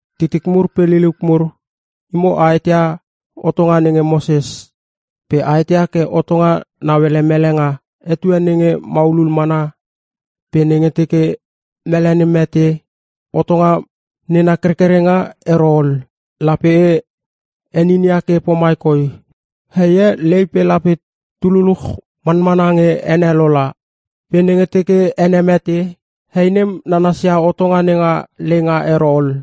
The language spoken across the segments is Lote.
Titik mur pe liliuk mur, Imo a eteia hotonga nenge Moses. Pe a eteia ke hotonga nauele mele nga etue nenge maulul mana, pe nenge teke mele nem mete, hotonga nena kerkerenga ero ol. Lape e heninia ke pomai koi; heie lei pe lape tu luluch manmana nge ene lola. Pe nenge teke ene mete, hei nem nanasia hotonga nenga leinga ero ol.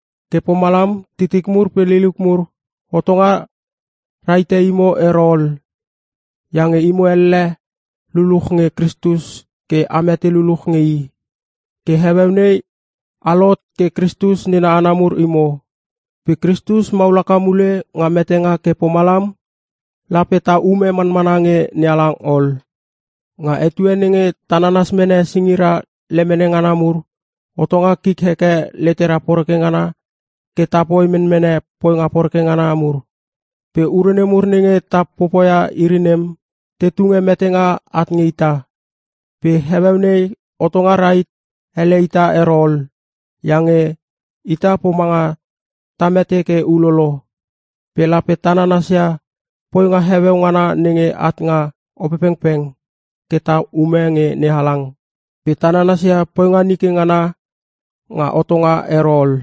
Ke pomalam titik mur pe liliuk mur, hotonga rahite imo ero ol, iange imo elle luluch nge Kristus ke a mete luluch nge I. Ke heueu nei a lohot ke Kristus nena hana mur imo. Pe Kristus maul haka mule nga metenga ke pomalam lape ta ume manmana nge NeHalang ol. Nga etue nenge ta nanas mene singira lemene ngana mur, hotonga kik heke letera poreke ngana ke tapoi menmene poinga poreke ngana mur. Pe ure nemur nenge ta popoia iri nem te tunge metenga at nge ita. Pe heueu nei hotonga rahit hele ita ero ol, iange ita pomanga ta mete ke ulolo. Pe lape ta nanasia poinga heueu ngana nenge at nga Opepengpeng ke ta ume nge NeHalang, pe ta nanasia poinga nike ngana nga hotonga ero ol.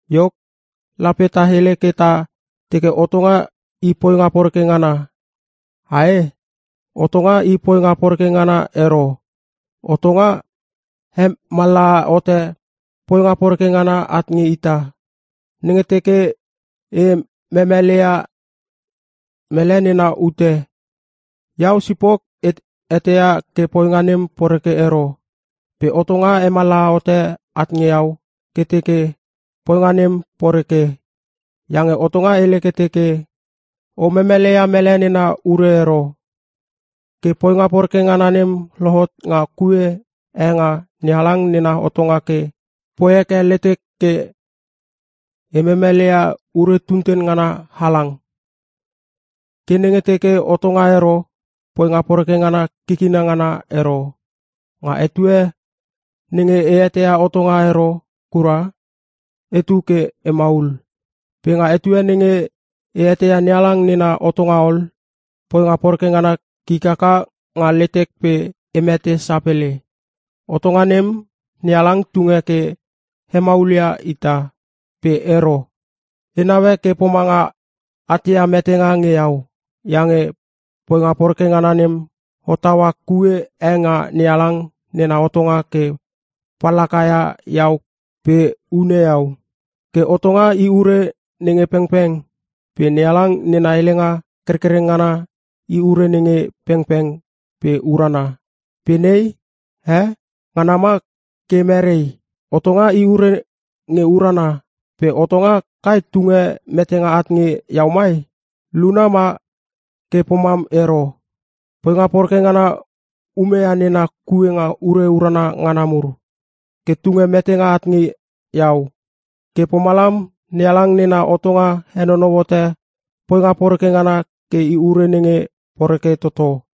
Iok, lape ta hele ke ta teke hotonga i poinga poreke ngana, ae? Hotonga i poinga poreke ngana ero! Hotonga hemallaha hote poinga poreke ngana at nge ita. Nenge teke e memeleia mele nena ute, iau sipok e eteia ke poinga nem poreke ero. Pe hotonga hemallaha hote at nge iau ke teke poinga nem poreke. Iange hotonga hele ke teke, “O memeleia mele nena ure ero.” Ke poinga poreke ngana nem lohot nga kue e nga NeHalang nena hotonga ke poi heke letek ke e memeleia ure tunten ngana halang. Ke nenge teke hotonga ero, poinga poreke ngana kikina ngana ero. Nga etue nenge e eteia hotonga ero kura etu ke emaul. Pe nga etue nenge e eteia NeHalang nena hotonga ol, poinga poreke ngana kik haka nga letek pe e mete sapele. Hotonga nem, NeHalang tunge ke hemaulia ita. Pe ero. E naue ke pomanga atia metenga nge iau. Iange poinga poreke ngana nem hottaua kue e nga NeHalang nena hotonga ke pallaka ia iau pe hune iau. Ke hotonga i ure nenge pengpeng pe NeHalang nena helenga kerkereng ngana i ure nenge pengpeng pe urana. Pe nei, eh? Ngana ma ke merei? Hotonga i ure nge urana pe hotonga kai tunge metenga at nge iau mai? Luna ma ke pomam ero! Poinga poreke ngana umeia nena kue nga ure urana ngana mur ke tunge metenga at nge iau. Ke pomalam NeHalang nena hotonga henonou hote poinga poreke ngana ke i ure nenge poreke toto.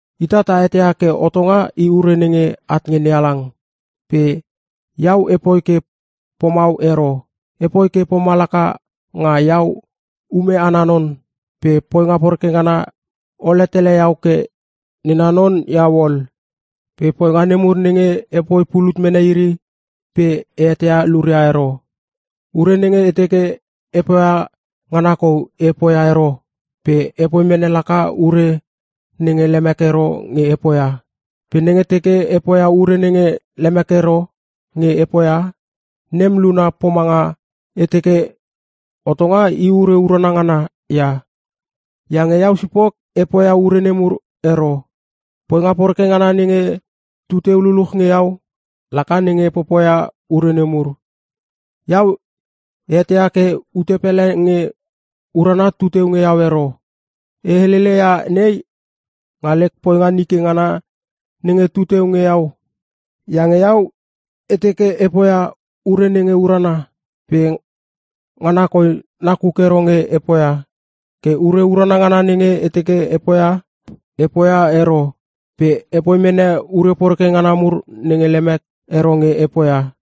Ita ta eteia ke hotonga i ure nenge at nge NeHalang pe iau epoi ke pomau ero. Epoi ke pomalaka nga iau ume ana non pe poinga poreke ngana ole tele iau ke nena non iau ol. Pe poinga nemur nenge epoi pulut mene iri pe e eteia luria ero. Ure nenge e teke e poia ngana kou e poia ero pe epoi mene laka ure nenge lemek ero nge e poia. Pe nenge teke e poia ure nenge lemek ero nge e poia, nem luna pomanga e teke hotonga i ure urana ngana ia. Iange iau sipok e poia ure nemur ero, poinga poreke ngana nenge tu teu luluch nge iau laka nenge popoia ure nemur. Iau e eteia ke ute pele nge urana tu teu nge iau ero. E helele ia nei, nga lek poinga nike ngana nenge tu teu nge iau. Iange iau e teke e poia ure nenge urana pe ngana koi nakuk ero nge e poia. Ke ure urana ngana nenge e teke e poia, e poia ero pe epoi mene ure poreke ngana mur nenge lemek ero nge e poia.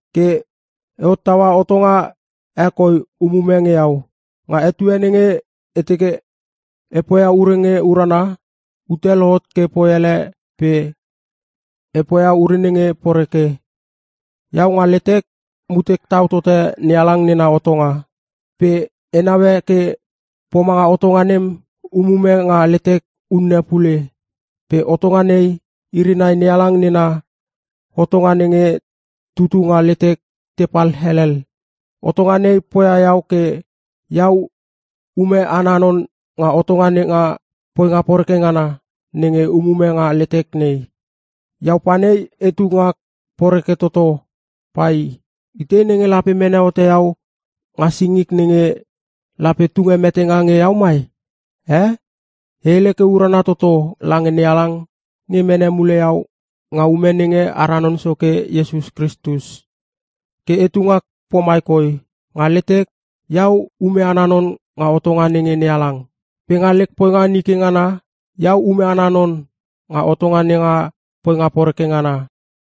Ke e hottaua hotonga e koi umume nge iau. Nga etue nenge e teke e poia ure nge urana, ute lohot ke poi ele pe e poia ure nenge poreke. Iau nga letek, mutek tau tote NeHalang nena hotonga. Pe e naue ke pomanga hotonga e nem umume nga letek unne pule. Pe hotonga nei, iri nai NeHalang nena hotonga nenge tutu nga letek tepal helel. Hotonga nei poia iau ke iau ume ana non nga hotonga nenga poinga poreke ngana nenge umume nga letek nei. Iau panei etu ngak poreke toto pai! Itei nenge lape mene hote iau nga singik nenge lape tunge metenga nge iau mai, e? E hele urana toto lange NeHalang nge mene mule iau nga ume nenge ara Non Soke Iesus Kristus! Ke etu ngak pomai koi; Nga letek, iau ume ana non nga hotonga nenge NeHalang. Pe nga lek poinga nike ngana, iau ume ana non nga hotonga nenga poinga poreke ngana.